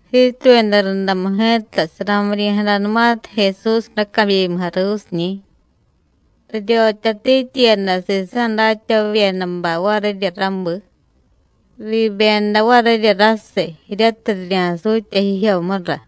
Jiituyada rundamu ji̱ta, saramiryi̱jadanumatiy Jesús racabyimu jaruusiñi̱, riryotyatityiyada sisa̱ datyavavyedabay varirya rabi. Riibyeda varirya rasiy, jiryatiy rirya̱sutya jijyomura.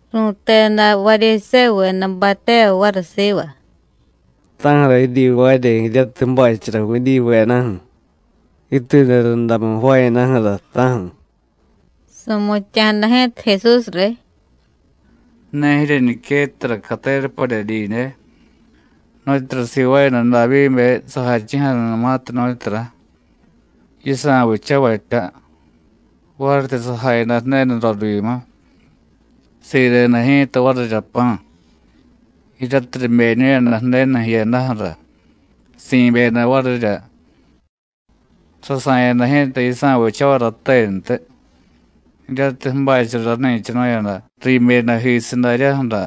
Ru̱teda Varyisévuvedabay tevay variy siva: “¿Ta̱ju̱ra jiryivaarya jiryatiy ju̱bachara Judíyuvedaju̱ jiituyada rundamu jvaayadaju̱ra, ta̱ju̱?” Su̱mutya̱jada ji̱ta Jesús riy: “¿Ne jiryeñiquettara catera padye didye, nu̱tyura sivaayada Davyíbe sajachi̱jadanumatiy, nu̱tyura? yisa̱ vichavatya. Varityi sajayada Ju̱denu rorivyimu, sireda ji̱ta varirya pa̱, jiryatiy ribeñu̱yada Ju̱denu jiyadaju̱ra, si̱byeda varirya. Sasa̱yada ji̱ta yisa̱ vichavay ratentiy, jiryatiy ju̱bachara rani̱chanu̱yada riibyedajisiy daryaju̱ra,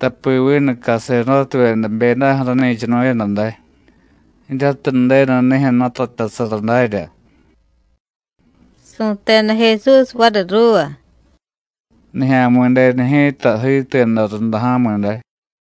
tapi vinu caserdótevyeda jbyedaju̱ rani̱chanu̱yada day, jiryatiy Ju̱denu nijyu̱ jnutatyasara darya.” Su̱teda Jesús variy ruuva: “Nijya̱mi̱denu ji̱ta jiituyada runda ja̱mi̱ day.”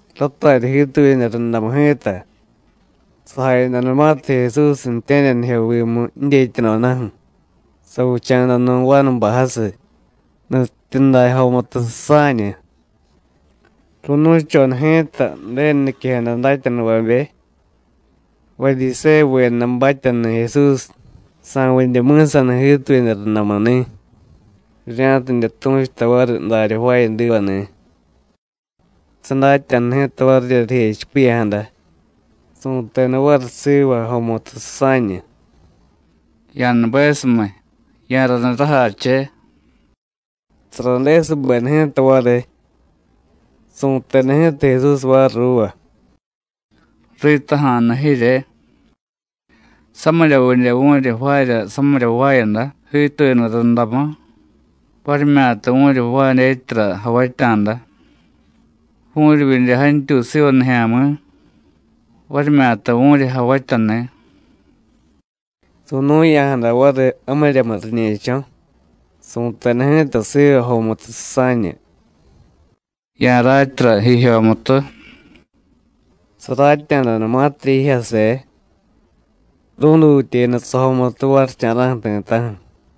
Ratarya jiituyada rundamu ji̱ta, sajayadanumatiy Jesús ju̱tye̱ryanijyovimu jidyetyadodaju̱, savicha̱da nu̱ vanubay jasiy, nutyityuday jomutu susa̱ñu. Ru̱nu̱choda ji̱ta Ju̱denu niquejada datyanuvabe, Varyisévuvedabatyani̱ Jesús, sa̱vidye mi̱saniy jiituyada rundamuni̱, rirya̱tidye tu̱chuta variy darya jvaayadivani̱. Sadatya̱da ji̱ta varirya rijechipiya̱jada, su̱teda variy siva jomutu susa̱ñu: “Ya̱nubesumiy, ya̱raniy rajache.” Saradesubeda ji̱ta variy. Su̱teda ji̱ta Jesús variy ruuva: “Ritaja̱nu jirye, ¿Samiryavidye vu̱ryi jvaarya samirya jvaayada jiituyada rundamu, varimyata vu̱ryi jvaay dyetyara javatya̱da? ¿Vu̱ryivyidye jantyuy siva nijya̱mi̱, varimyata vu̱ryi javatyani̱?” Su̱nu̱ya̱jada variy jamiryamu riñe̱cho̱, su̱teda ji̱ta siva jomutu susa̱ñu: “Ya̱ratyara jijyomutu.” Saratya̱danumatirya jijyase, rú̱dutyeda sajomutu varicha̱ra̱ju̱ ti̱ta̱ju̱.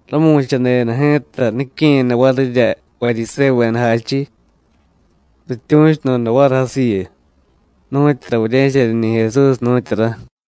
Ramu̱chadeda ji̱ta nique̱yada varirya Varyisévuveda jachiy, rityu̱chudoda variy jasiyu: “¿Nu̱tyura vurye̱chaniñi̱ Jesús, nu̱tyura?”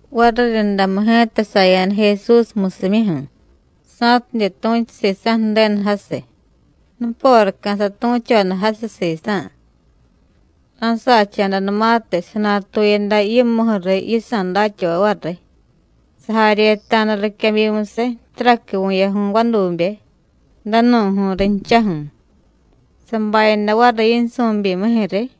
Variryundamu ji̱ta saya̱da Jesús musimyuju̱, sa̱tidye tu̱chu sisa̱ Ju̱denu jasiy, nuporaca̱ satu̱choda jasiy sisa̱. Ra̱sacha̱danumatiy, sanatuyada yimuju̱ riy yisa̱ datyavay variy, sajaryeta̱da riquebyimusiy taraqui vu̱yaju̱y vadube, danu̱ju̱y rinchaju̱, sabayada variy yinsu̱byimijyu̱ riy.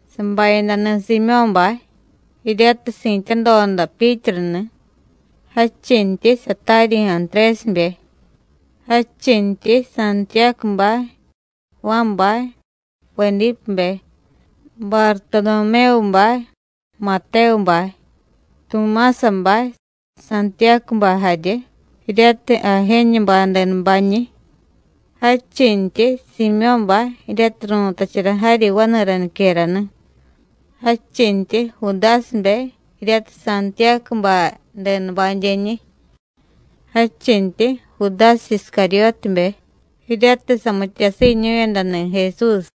Sabayadani̱ Siimyó̱bay, jiryatiy si̱tyadoda Pyítruni̱, jadchintyi sataryi̱ Antrésibe, jadchintyi Santiyácubay, Juánbay, Vedípebe, Bartodomévubay, Matévubay, Tumásabay, Santiyácubay jarye jiryatiy Ajéñubay denubañi̱. Jadchintyi Siimyó̱bay jiryatiy ru̱tachara jaryi vani̱ra niquerani̱, jadchintyi Judásibe, jiryatiy Santiyácubay denubadyeñi̱, jadchintyi Judásiy Iscaryótibe jiryatiy samityasiiñu̱yadani̱ Jesús.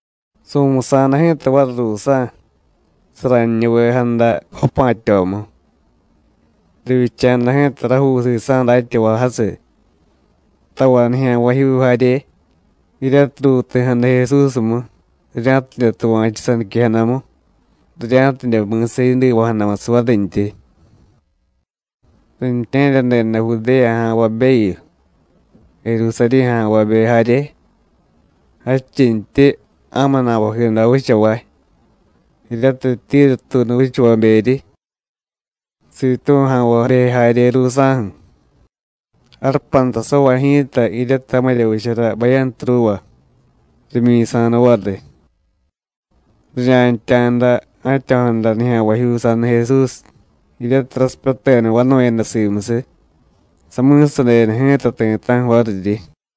Su̱musa̱da ji̱ta variy ruusa̱, saraniñuvejada vapa̱tyomu. Rivyicha̱da ji̱ta rajuu sisa̱ datyavay jasiy, tavay nijya̱nvajyuu jarye, jiryatiy ruuti̱jada Jesúsmu, rirya̱tidye tuva̱chu saniquejadamu, rirya̱tidye mi̱sa yidiva̱jadamusiy varintyi. Riintye̱ryadeda Judéya ja̱nvabeyu, Jerusarí̱ ja̱nvabe jarye. Jadchintyi ja̱mu na̱vajido vichavay, jiryatiy Tíru tuunu vichavaberyi, Sitú̱ ja̱nvabe jarye ruusa̱ju̱. Jarupantasavay ji̱ta, jiryatiy jamirya vichara bayantu ruuva, rimyi̱sa̱da variy. Rirya̱ntya̱da ja̱tyo̱jada nijya̱nvajyuu saniy Jesús, jiryatiy rasipyateda vanu̱yada simusiy, sami̱sadeda ji̱ta ti̱ta̱ju̱ variryi.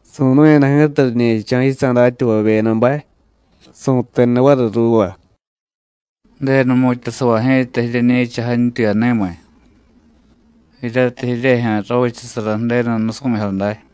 Su̱nu̱yada ji̱ta riñe̱cho̱ yisa̱ datyavavyedabay, su̱teda variy ruuva: “Ju̱denu jmu̱tyasavay ji̱ta jiryeñi̱cha jantyuyani̱miy, jiryatiy jiryejyu̱ ravichasara Ju̱denu nusu̱jyo day.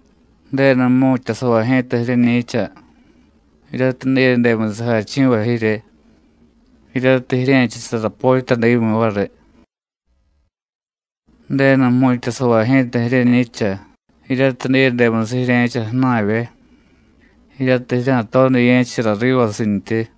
Ju̱denu jmu̱tyasavay ji̱ta jiryeñi̱cha jiryatiy diyedemusiy jachi̱vay jirye, jiryatiy jirye̱chasara potyadimyi variy. Ju̱denu jmu̱tyasavay ji̱ta jiryeñi̱cha jiryatiy diyedemusiy jirye̱cha ju̱na̱vye, jiryatiy jirya̱todiye̱chara rivasintyi.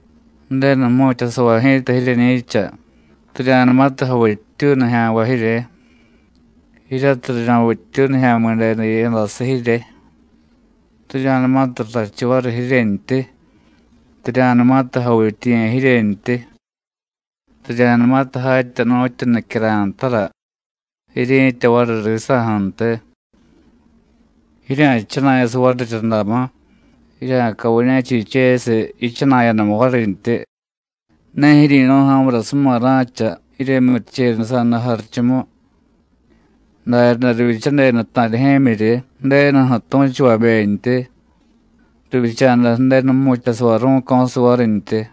Ju̱denu jmu̱tyasavay ji̱ta jiryeñi̱cha, rirya̱numatiy javittyuy nijya̱nvay jirye, jiryatiy rirya̱vittyuy Nijya̱mi̱denu jiyadasiy jirye, rirya̱numatiy rrachu variy jiryentyi, rirya̱numatiy javityiye̱ jiryentyi, rirya̱numatiy jatya nu̱tyu nicyara̱y ntara jiryi̱tya variy risa̱ju̱ntiy. Jirya̱jchana̱yasiy variryundamu, jirya̱caviñe̱chichesiy yichana̱yadamu varintyi, ne jiryi̱nu̱y, ja̱murasuma ra̱cha jiryemyurichenusa̱da jarichumu; daryaday rivyichadeda ta̱rijye̱myiryi Ju̱denuju̱ tu̱chuvabentyi, rivyicha̱da Ju̱denu jmu̱tyasavay ru̱co̱siy varintyi.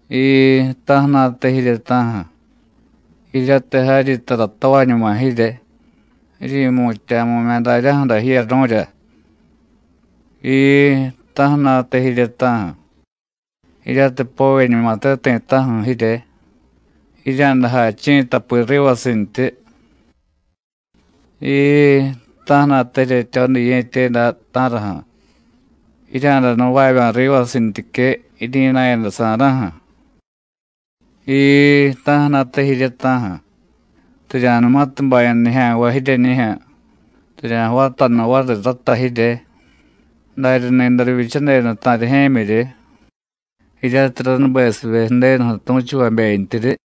Jiii, ta̱ju̱na̱te jirye, ta̱ju̱, jiryatiy jaryi tara tavañuma jirye, jiryi̱mutya̱mu̱mya̱ daryaju̱ra jiyaru̱rya. Jiii, ta̱ju̱na̱te jirye, ta̱ju̱, jiryatiy povyeñumate ti̱ta̱ju̱ jirye, jirya̱day jachi̱ tapi rivasintyi. Jiii, ta̱ju̱na̱te jiryetyodiye̱tye day, ta̱raju̱, jirya̱day nuvavya̱ rivasintyique jiryi̱na̱yadasa̱ra̱ju̱. Jiii, ta̱ju̱na̱te jirye, ta̱ju̱, rirya̱numatiy baya̱ nijya̱nvay jiryeñijyu̱, rirya̱jvatanu variy rata jirye, darya ni̱day rivyichadeda ta̱rijye̱myiryi, jiryatiy ránubesivye Ju̱denuju̱ tu̱chuvabentyiryi.”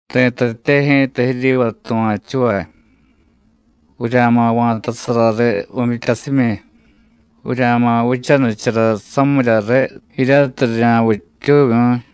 “Ri̱tatye ji̱ta jiryiva tuva̱chuvay: Vurya̱ma̱ va̱tasara riy vu̱myityasimyi; vurya̱ma̱ vichanichara samiryariy jiryatiy rirya̱vittyuvyu̱y.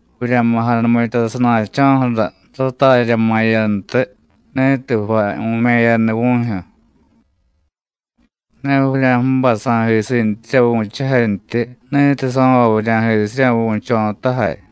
Vurya̱ma̱ janumitya sana̱cho̱ju̱ra ratarya ma̱yantiy, ni̱tiy jvay vu̱me̱yaniy vu̱jyu̱; ne vurya̱ju̱bay sa̱jisintyirya vu̱chujantyi ni̱tiy so̱vay vurya̱jisirya vu̱cho̱tajay.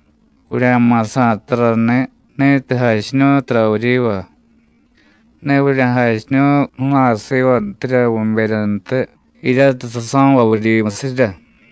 Vurya̱ma̱ sa̱y tarani̱ ni̱tiy jachiñu̱y tara vuryiva; ne vurya̱jachiñu̱y ju̱na̱y sivantirya vu̱beryantiy, jiryatiy saso̱vay vuryimusirya.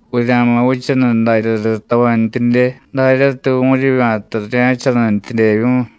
Vurya̱ma̱ vichaniy darya riy tavantyidye, daryatiy vu̱ryivya̱ta rirya̱vichanintyidyevyu̱y.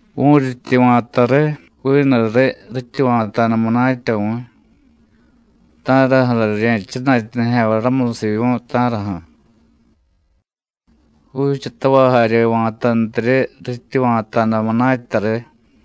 Vu̱ryityi va̱ta riy, vinuriy rityi va̱ta̱da munatya vu̱y, ¿ta̱raju̱ra rirye̱jchana̱tya nijya̱nvay ramusiy vu̱y, ta̱raju̱? Juuchatavay jarye va̱tantiryi rityi va̱ta̱da munatya riy.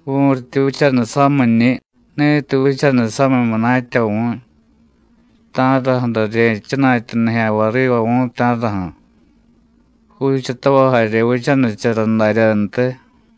Vu̱ryityi vichaniy samiñi̱, ni̱tiy vichaniy samiy munatya vu̱y, ¿ta̱raju̱ra rirye̱jchana̱tya nijya̱nvay riva vu̱y, ta̱raju̱? Juuchatavay jarye vichanichara daryantiy.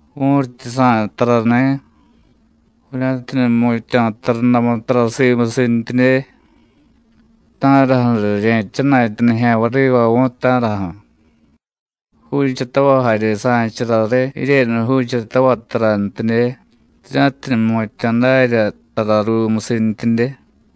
Vu̱ryityi sa̱y tarani̱, vurya̱tidye jmutya̱ tarundamu tara simusintyidye, ¿ta̱raju̱ra rirye̱jchana̱tya nijya̱nvay riva vu̱y, ta̱raju̱? Juuchatavay jarye sa̱chara riy jiryenu juuchatavay tarantidye, rirya̱tidye jmutya̱ darya tara ruumusintyidye.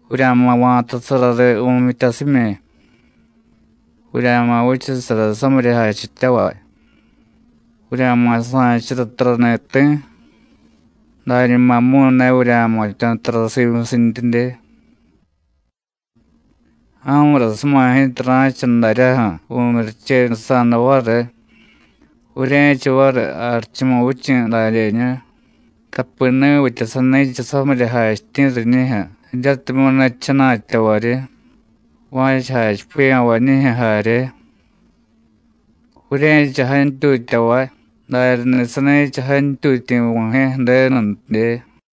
Vurya̱ma̱ va̱tasara riy vu̱myityasimyi, vurya̱ma̱ vichasara samirya jachityavay; vurya̱ma̱ sa̱chara tarani̱ ti̱, dañumamu̱y ne vurya̱jmutya̱ tara simusintyidye. Ja̱murasuma ji̱ta ra̱cha daryaju̱ vu̱myurichenusa̱da variy, vurye̱cha variy Jarichumuvichi̱ dadyeñu; tapi ni̱vitya sani̱cha samirya jachityi̱ riñijyu̱ jiryatimyu̱ ne jchana̱tyavaryi, va̱cha jachipiya̱vañijyu̱ jarye. Vurye̱cha jantyutyavay, daryani̱ sani̱cha jantyutyi̱ Vu̱jye̱ Ju̱denuntidye.”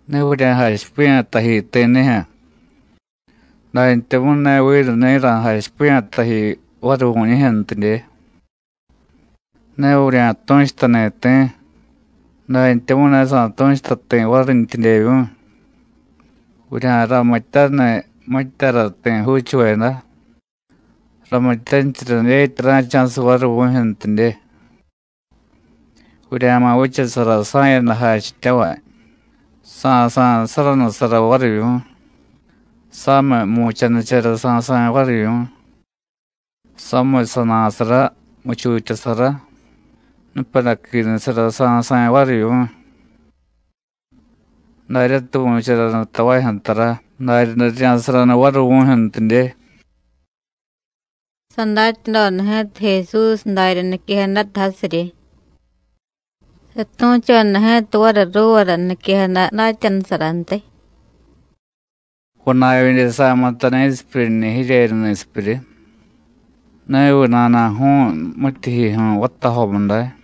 “Ne vurya̱jachipiya̱ taji ti̱nijyu̱, dantyamu̱y ne vinu ni̱ ra̱jachipiya̱ taji variy vu̱ñijyu̱ntidye. Ne vurya̱tu̱chutani̱ ti̱, dantyamu̱y ne sa̱tu̱chuta ti̱ varintyidyevyu̱y. Vurya̱ramityaniy mityara ti̱ juuchuveda; ramityanichara dyetya ra̱cha̱siy variy vu̱jyu̱ntidye. Vurya̱ma̱ vichasara sa̱yada jachityavay, Sa̱sa̱y saranusara varivyu̱y, samiy mu̱chanichara sa̱sa̱y varivyu̱y, samiy sana̱sara; muchutyasara, nupadaquinusara sa̱sa̱y varivyu̱y. Daryatiy vu̱charanu tavajyu̱ tara, daryaday rirya̱saranu variy vu̱jyu̱ntidye.” Sadatyadoda ji̱ta Jesús darya niquejadata jasiryi. Satu̱choda ji̱ta variy ruuvara niquejada datyanusarantiy: “¿Vana̱vyidye sa̱mutay ni̱sipyuryiñi̱ jiryenu ni̱sipyuryi? ¿Neviy nana̱ju̱u̱y mityijyijyu̱y vatajomu day?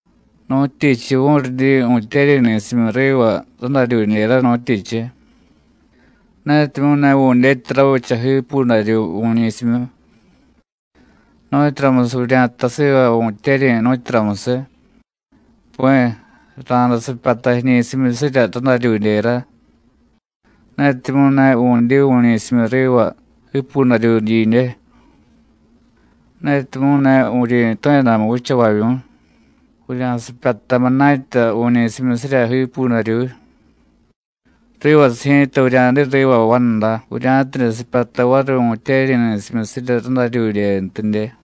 ¿Nu̱tyichiy vu̱ryidyi vu̱tyeryi̱ ni̱simyu riva radaryudyera, nu̱tyichiy? netimyu̱ ne vu̱dyetya ravicha jiipudaryuy vu̱ñi̱simyu. ¿Nu̱tyuramusiy vurya̱jtay siva vu̱tyeryi̱, nu̱tyuramusiy? Pi̱, ra̱day sipyata jiñi̱simyusirya radaryudyera, netimyu̱ ne vu̱dyi vu̱ñi̱simyu riva jiipudaryuy didye. Netimyu̱ ne vuryi̱tu̱yadamu vichavavyu̱y, vurya̱sipyata munatya vu̱ñi̱simyusirya jiipudaryuy, rivasiy ji̱ta vurya̱diy riva vanda, vurya̱tidye sipyata variy vu̱tyeryi̱ ni̱simyusirya radaryudyentidye.”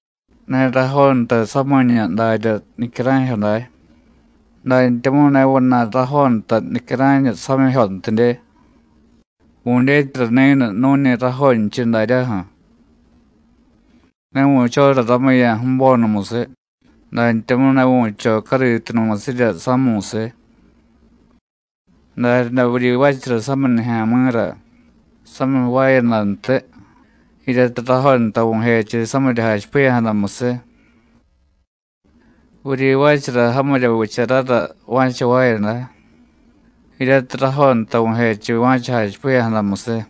“Ne rajontay samiñu darya nicyara̱jyo day, dantyamu̱y ne vana̱y rajontay nicyara̱ñu samijyontidye. Vu̱dyetyara ni̱nu nu̱ñi rajonchiy daryaju̱. Ne vu̱chora ramuya̱ ju̱bonumusiy, dantyamu̱y ne vu̱cho cariitunumusirya sámu̱síy. Daryaday vuryivaachara samiy nijya̱mi̱ra samiy jvaayadantiy, jiryatiy rajontay vu̱jechiy samirya jachipiya̱jadamusiy. Vuryivaachara jamirya vicharara va̱cha jvaayada, jiryatiy rajontay vu̱jechiy va̱cha jachipiya̱jadamusiy.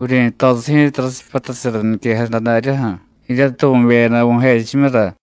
Vuryi̱tosiy ji̱ta rasipyatachara niquejada daryaju̱ jiryatiy vu̱beyada vu̱jechimyura.”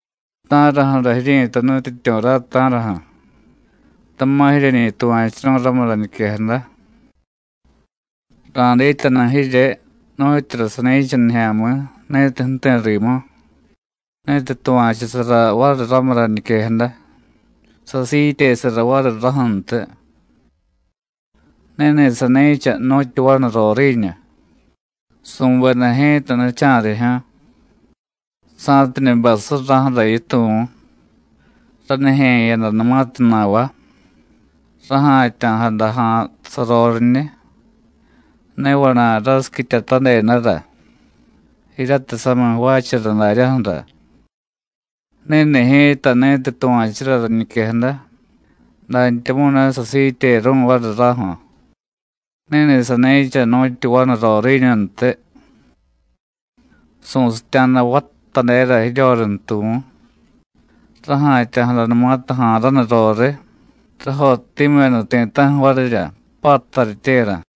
“¿Ta̱raju̱ra jiryi̱tay Nutyityu̱ ray, ta̱raju̱? tama̱ jiryeñi tuva̱churu̱y ramu rañiquejada. Ra̱dityanu jirye nu̱tyura sani̱cha nijya̱mi̱ ni̱tiy ju̱ti̱ rimu, ni̱tiy tuva̱chusara variy ramu rañiquejada, sasiityesara variy raju̱ntiy. Ni̱ni̱ sani̱cha nu̱tyu vanu roriiñu. Su̱beda ji̱ta nicha̱rijyu̱, sa̱tidye bay surraju̱ra yituvu̱. Ranijye̱yadanumatiy na̱va, raja̱tya̱jada ja̱a̱ saroriñiy, ne vana̱y rasiquityatadedara, jiryatiy samiy jvaachara daryaju̱ra. Ni̱ni̱ ji̱ta ni̱tiy tuva̱chura rañiquejada, dantyamu̱y ne sasiityeru̱y variy raju̱, ni̱ni̱ sani̱cha nu̱tyu vanu roriiñuntiy. Su̱sitya̱da vattadera jiryorintuvu̱. Raja̱tya̱jadanumatiy ja̱a̱ raniy roriy, rajottimyu̱yada ti̱ta̱ju̱ varirya, pattaryityera.”